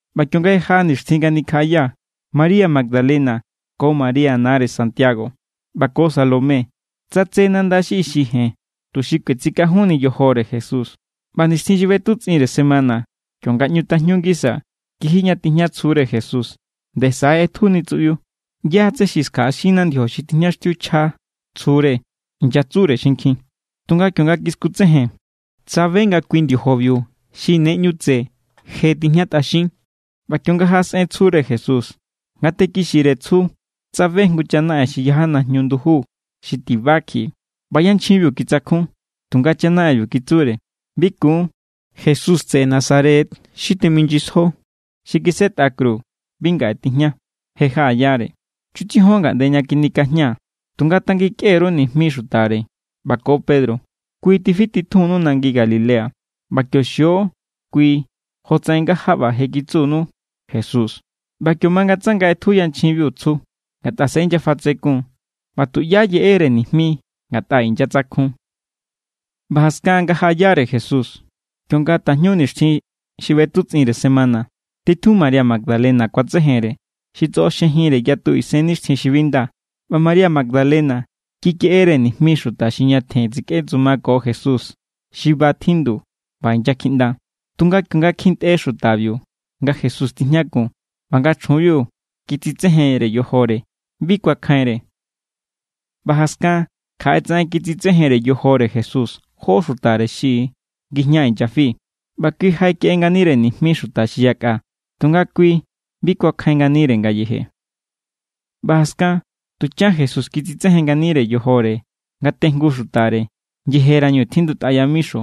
ꞌBa kionga je jaꞌa nixtjin nga nikjaꞌaya, María Magdalena, ko María nare Santiago, ꞌba ko Salomé, tsatse nanda xi ixi jen tuxi kuetsikajunni yojore Jesús. ꞌBa nixtjin xi ꞌbetutsꞌinnire semana, kionga ꞌñu tajñu ngisa, kiji ña tijña tsjure Jesús, nde saꞌe= ꞌetjuni tsuꞌbiu. —¿Yá= tsé xi skjaꞌaxinna ndiojobi xi tijñaxtiuchja tsjure? —inyatsure xinkjin. Tunga kionga kiskutsejen, tsabe nga kui ndiojobiu xi ne ꞌñu tse je tijñatꞌaxin. ꞌBa kionga jaꞌasꞌen tsjure Jesús, ngate kixire tsju tsabe jngu chanaꞌen xi yaja najñu nduju xi tiba kjiꞌi; ꞌba yanchjinbiu kitsakjun. Tunga chanaꞌenbiu kitsure: —Bi kun; Jesús tseꞌe Nazaret xi teminyisjo xi kisetꞌa kru, bi ngaꞌe tijña. Je jaꞌayare. Chutsijon ngaꞌnde ña kjinikajña. Tunga tangikꞌe_ru nijmi xutare, ꞌba ko Pedro: “Kui= tifititjunnu nangi Galilea; ꞌba kio xio kui jotsaꞌen nga jaꞌba je kitsunu Jesús.” ꞌBa kio mangatsanga ꞌetju yanchjinbiu tsju, ngatꞌa se inyafatsekun=. ꞌBa tuꞌyá yeꞌere nijmi ngatꞌa inyatsakjun. ꞌBa jaskan nga jaꞌayare Jesús, kionga tajñu nixtjin xi ꞌbetutsꞌinre semana, titjun María Magdalena kuatsejenre, xi tsꞌoxjejinre yatu isennixtjin xi bi nda. ꞌBa María Magdalena kikeꞌere nijmi xuta xi ñatjen tsikꞌetsumako Jesús, xi ba tjindu ꞌba inyakjiꞌnda. Tunga kionga kjintꞌe xutabiu nga Jesús tijñakun, ꞌba nga chjunbiu kitsitsejenre yojore, bi kuakjainre. ꞌBa jaskan kjaꞌe tsaꞌen, kitsitsejenre yojore Jesús jó xutare xi ngijña inyafi. ꞌBa kui jaꞌekeꞌe nganire nijmi xuta xi yakꞌa; tunga kui bi kuakjain nganire ngayeje. ꞌBa jaskan tuchan Jesús kitsitsejen nganire yojore ngatejngu xutare, yejerañu tjindutꞌa yamixo;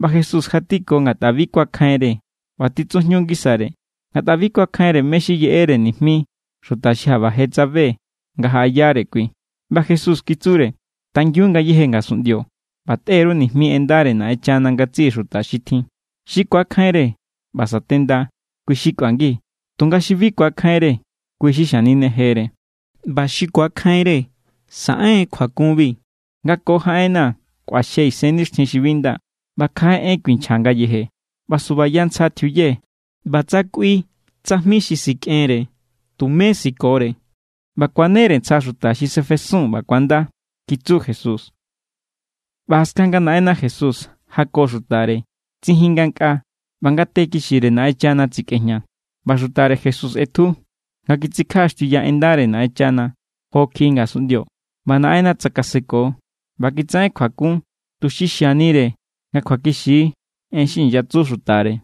ꞌba Jesús jatiko ngatꞌa bi kuakjainre ꞌba titsujñu ngisare, ngatꞌa bi kuakjainre mé= xi yeꞌere nijmi xuta xi jaꞌba je tsabe nga jaꞌayare kui. ꞌBa Jesús kitsure: —Tangiun ngayéje ngasunꞌndio, ꞌba tꞌe_ru nijmi en ndare Naꞌenchana ngatsiꞌi xuta xi tjin. Xi ku̱akjainre ꞌba satenda, kui= xi kꞌuangi; tunga xi bi ku̱akjainre, kui= xi xaninejere. ꞌBa xi ku̱akjainre saꞌen= kjuakunbi: Nga ko jaꞌenna̱ kꞌuaxje isennixtjin xi bi nda; ꞌba kjaꞌe en kuinchja ngayeje; ꞌba subaya ntsja tjiuye, ꞌba tsa kꞌui tsajmi xi sikꞌenre, tumé sikore; ꞌba kuanere ntsja xuta xi sefesun ꞌba ku̱anda —kitsu Jesús. ꞌBa jaskan nga Naꞌenna Jesús jako xutare, tsijin ngankꞌaa, ꞌba ngate kixire Naꞌenchana tsikꞌejña. ꞌBa xutare Jesús ꞌetju, nga kitsikjaꞌaxtiuya en ndare Naꞌenchana jo kjiꞌi ngasunꞌndio. ꞌBa Naꞌenna tsakaseko, ꞌba kitsaꞌen kjuakun, tuxi xianire nga kjuakixi= en xi inyatsu xutare.